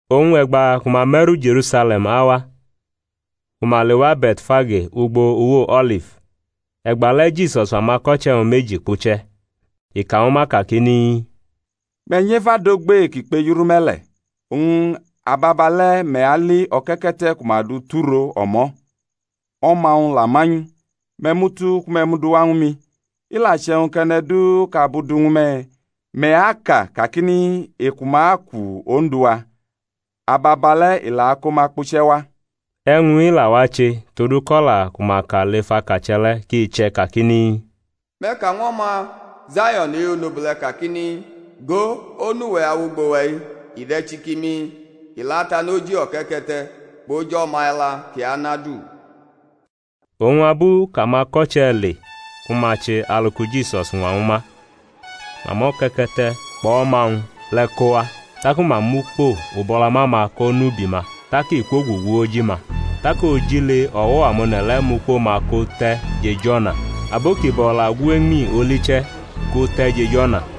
Oñ e̩gba ku ma me̩ru Je̩rusale̩m awa, ku ma lewa Be̩tfage ugbo uwo O̩lif, e̩gbale̩ Jisus fʼamako̩che̩-wñ meji kpuche̩. I ka ñwu ma kakini, Me̩ nyʼef adogbe kʼi kpejurʼume̩ le̩, oñ ababale̩ me̩ ali o̩ke̩ke̩te̩ ku ma dʼu tʼuro o̩mo̩, o̩ma-wñ la manyʼu. Me̩ mutu ku me̩ dʼu wa ñwu mi. I la che̩wñ kʼe̩ne̩ du kʼabu du ñwu me̩, me̩ aka kakini, Eku-ma aku Ondu-wa. Ababale̩ i la ako ma kpuche̩ wa. E̩wñ-i la wache todu kʼo̩la ku ma ka lef akache̩ le̩ kʼi che̩ kakini, Me̩ ka ñw o̩ma Zayo̩n e-onobule̩ kakini, Go, Onu-we̩ awʼugbo-we̩-i; i de̩ chikimi, i la tanʼoji o̩ke̩ke̩te̩, kpʼoj o̩ma e̩la kʼi anʼadu. Oñ abu kʼamako̩che̩ le ku ma che alu ki Jisus ñwa ñwu ma, ma mʼo̩ke̩ke̩te̩ kpʼo̩ma-wñ le̩ ko wa. Taku ma mʼukpo ubo̩lama-ma ko nʼubi ma, tak i kwogugu oji-ma. Tak ojile o̩wo̩ amone̩ le̩ mʼukpo-ma ko te̩ jʼej o̩na, abo kibo̩ la gu eñmi oli che̩ ko te̩ jʼej o̩na.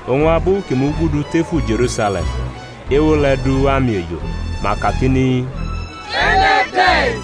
Oñ abu kʼi mugudu tefu Je̩rusale̩m ewo le̩ du amiejo, ma kakini, E̩ne̩ de̩-i?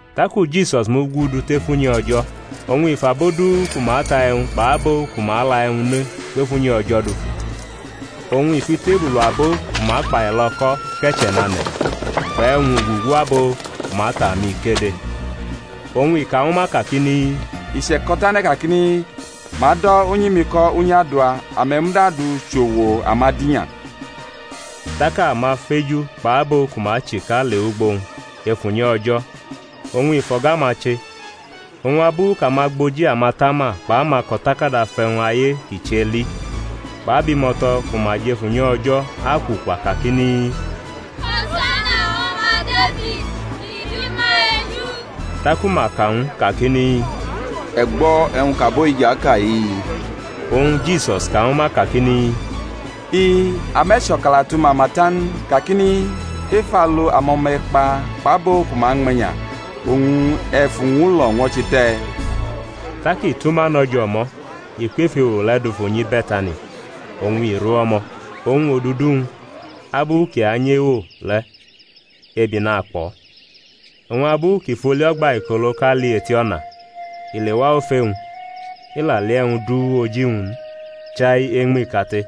Taku Jisus mugudu tef unyi O̩jo̩, oñ i fʼabo du ku ma ta e̩wñ kpʼabo ku ma la e̩wñ ne kwef unyi O̩jo̩ dufu. Oñ i fʼitebulu abo ku ma kpailo̩ o̩ko̩ ke̩che̩ nʼane̩, kpʼe̩wñ ugugu abo ku ma ta amikede. Oñ i ka ñwu ma kakini, I che̩ko̩ tane̩ kakini, Ma ado̩ unyi-mi ko̩ unyi adua, ame̩ muda dʼu chʼo̩wo̩ amadinya. Tak amafeju kpʼabo ku ma chika lewʼugbo-wñ ef unyi O̩jo̩, oñ i fʼo̩ga-ma che. Oñ abu kʼamagboji amatama kpʼamako̩takada fʼe̩wñ aye kʼi che li, kpʼabimo̩to̩ ku ma jʼef unyi O̩jo̩ akwukwa kakini, Hosana ñw O̩ma Defid, i bi ma eju. Taku ma ka ñw u kakini, E̩ gbo̩ e̩wñ kʼabo-i jʼaka-i? Oñ Jisus ka ñwu ma kakini, I-i; ame̩ chʼo̩kalatu mama ta n kakini, Ef alu amo̩ma e̩kpa kpʼabo ku ma ñme̩nya oñ e̩ fʼuñwulo̩ ñwo̩che te̩? Tak i tʼuma no̩ jʼo̩mo̩, i kwʼef ewo le̩ dufu nyi Be̩tani, oñ i ru o̩mo̩. Oñ odudu-wñ abu kʼi anyʼewo le̩ ebi nakpʼo̩. Oñ abu kʼi fʼoli o̩gbaikoloʼka li eti o̩na, i lewa ofe-wñ, i la li e̩wñ du oji-wñ n, chai eñmi kate.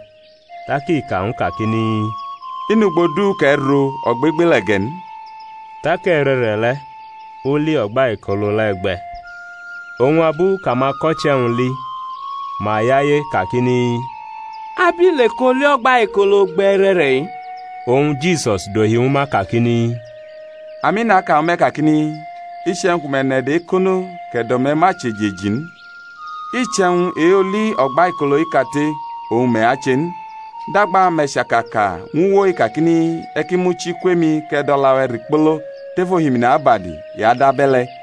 Tak i ka ñw u kakini, I nʼugbo du kʼe̩ ro ogbegbele̩ ge̩ n. Tak e̩re̩re̩ le̩ oli o̩gbaikolo le̩ gbe̩. Oñ abu kʼamako̩che̩-wñ li ma yaye kakini, Abile kʼoli o̩gbaikolo gbe̩ e̩re̩re̩-i? Oñ Jisus dohi ñwu ma kakini, Ami, naka ñwu me̩ kakini, Iche̩wñ ku me̩ nʼe̩do̩ ekono, kʼe̩do̩-me̩ ma chʼejeji n, iche̩wñ e-oli o̩gbaikolo-i kate oñ me̩ ache n; dagba me̩ chaka ka ñw uwo-i kakini, E̩ ki muchi kwʼemi kʼe̩ dʼo̩la-we̩ rikpolo tef ohimini abadi, i adʼabe̩le̩.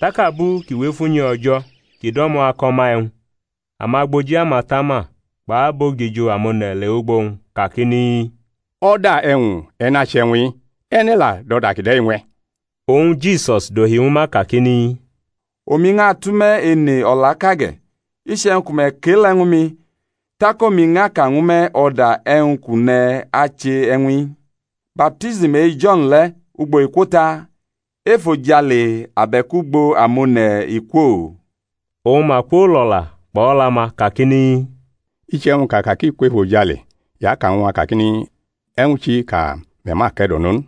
Tak abu kʼi wʼef unyi O̩jo̩ kʼi do̩mo̩ ako̩ ma e̩wñ, amagboji amatama kpʼabogijo amone̩ lewʼugbo-wñ kakini, O̩da e̩wñ e̩ nʼache e̩wñ-i? E̩ne̩ la dʼo̩da kide̩ ñwe̩? Oñ Jisus dohi ñwu ma kakini, Omi ñʼatʼume̩ ene o̩laʼka ge̩, iche̩wñ ku me̩ kʼe-le̩ ñwu mi, tak omi ñʼaka ñwu me̩ o̩da e̩wñ kʼu ne̩ ache e̩wñ-i. Baptism e-Jo̩n le̩, ugbo i kwo ta? Efojale abe̩k ugbo amone̩ i kwo? Oñ ma kwolo̩la kpʼo̩la-ma kakini, Iche̩wñ kʼa ka kʼi kwʼefojale, i aka ñw a kakini, E̩wñ chi kʼame̩ ma ke̩do̩nʼo n?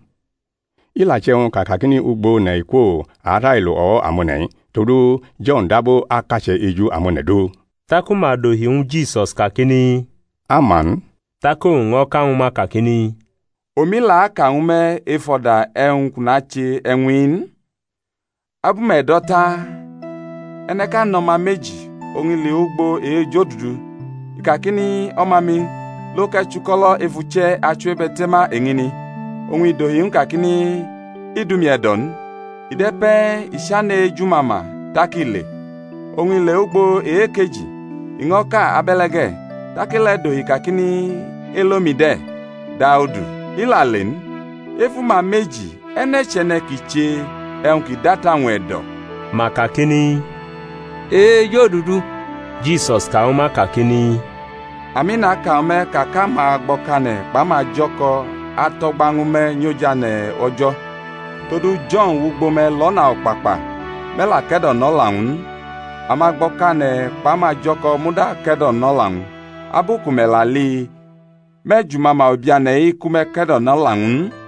I la che̩wñ kʼa kakini, Ugbo one̩ i kwo, a arailo o̩wo̩ amone̩-i, todu Jo̩n dab akache̩ eju amone̩ du. Taku ma dohi ñwu Jisus kakini, A ma n. Tak owñ ño̩ ka ñwu ma kakini, Omi la aka ñwu me̩ ef o̩da e̩wñ kʼu nache e̩wñ-i n. Abu me̩ do̩ ta? E̩ne̩ʼka nʼo̩ma meji; oñ i lewʼugbo e-ejodudu, i kakini, O̩ma-mi, lo kʼe̩ chʼuko̩lo̩ ef uche̩ achiwebe̩te̩ma eñini. Oñ i dʼohi ñw u kakini, I dʼumi e̩do̩ n. I de̩ pe̩e̩, i chane̩ ejumama tak i le. Oñ i lewʼugbo e-ekeji, i ño̩ ka abe̩le ge̩. Tak e-le̩ dohi kakini, Elo-mi de̩, Daudu. I la le n. Ef uma meji e̩ne̩ chʼe̩ne̩ kʼi che e̩wñ ki dʼata-wñ e̩do̩? Ma kakini, E-ejodudu. Jisus ka ñwu ma kakini, Ami, naka ñwu me̩, ka kʼamagbo̩kane̩ kpʼamajo̩ko̩ atʼo̩gba ñwu me̩ nyʼojane̩ O̩jo̩. Todu Jo̩n wʼugbo me̩ lʼo̩na o̩kpakpa, me̩ la ke̩do̩nʼo̩la-wñ n; amagbo̩kane̩ kpʼamajo̩ko̩ muda ke̩do̩nʼo̩la-wñ. Abu ku me̩ la li, me̩ jumama ubiane̩-i ku me̩ ke̩do̩nʼo̩la-wñ n.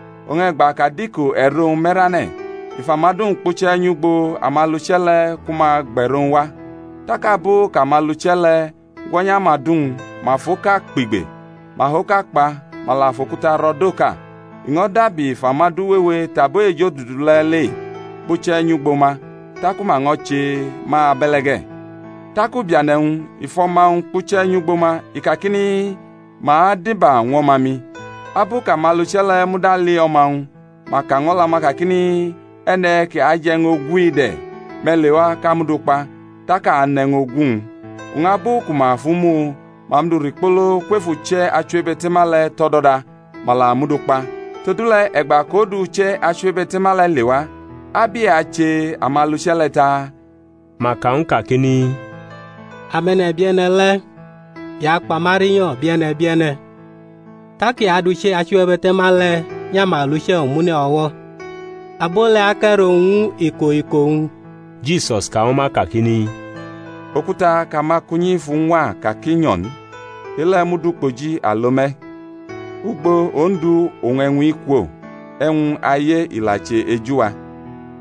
Oñ e̩gba kʼadiko e̩ro-wñ me̩rane̩ i fʼamadu-wñ kpuche̩ nyʼugbo amaluche̩ le ku ma gbʼe̩ro-wñ wa. Tak abu kʼamaluche̩ le̩ gwo̩nyʼamadu-wñ, ma fʼoka kpigbe, ma fʼoka kpa, ma la fʼokuta ro̩ dʼoka. I ño̩ dabi fʼamadu wewe tʼabo ejodudu le̩ le kpuche̩ nyʼugbo ma, taku ma ño̩ che ma abe̩le̩ ge̩. Tak ubiane̩-wñ i fʼo̩ma-wñ kpuche̩ nyʼugbo ma, i kakini, Ma adiba ñw o̩ma-mi. Abu kʼamaluche̩ le̩ muda li o̩ma-wñ ma ka ñw o̩la-ma kakini, E̩ne̩ ki aje̩ e̩wñ ogu-i de̩. Me̩ lewa, kʼa mʼu du kpa, tak a anʼe̩wñ ogu-wñ. Oñ abu ku ma fʼu mu, ma mʼu du rikpolo kwef uche̩ achiwebe̩te̩ma le̩ tʼo̩do̩da, ma la mʼu du kpa. Todule̩, e̩gba kʼodu uche̩ achiwebe̩te̩ma le̩ lewa, ab i ache amaluche̩ le̩ taa? Ma ka ñw u kakini, Ame̩ne̩bie̩ne̩ le̩, i akpa ma rinyo̩ bie̩ne̩ bie̩ne̩, tak i adʼuche̩ achiwebe̩te̩ma le̩ nyʼamaluche̩ omune̩ o̩wo̩, abo le̩ akʼe̩ro-wñ ñw u iko iko-wñ. Jisus ka ñwu ma kakini, Okuta kʼamakunyi fʼu ñwa ka kʼi nyo̩ n, e-le̩ mud ukpoji alo me̩. Ugbo Ondu oñ e̩wñ-i kwo, e̩wñ aye i la che eju-wa;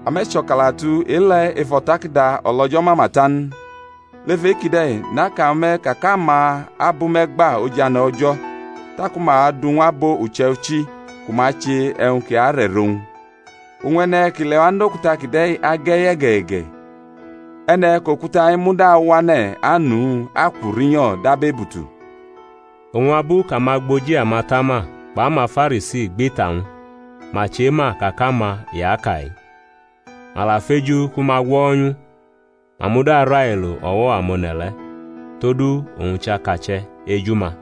ame̩ cho̩kalatu e-le̩ ef O̩takada O̩lo̩jo̩ mama ta n? Lef e-kide̩ naka ñwu me̩ ka kʼama abʼume̩ gba ojane̩ O̩jo̩, taku ma adʼu ñw abo uche̩ichi ku ma ache e̩wñ kʼi arʼe̩ro-wñ. [ Oñ e̩ne̩ kʼi lewa nʼokuta kide̩ age̩ye̩geye̩ge̩; e̩ne̩ kʼokuta-i muda awane̩ anʼu akwu rinyo̩ dab ebutu.] Oñ abu kʼamagboji amatama kpʼamaFarisi gbʼita-wñ ma chema ka kʼama i aka-i. Ma la feju ku ma gwo̩nyʼu, ma muda railo o̩wo̩ amone̩ le̩, todu owñ chʼakache̩ eju-ma.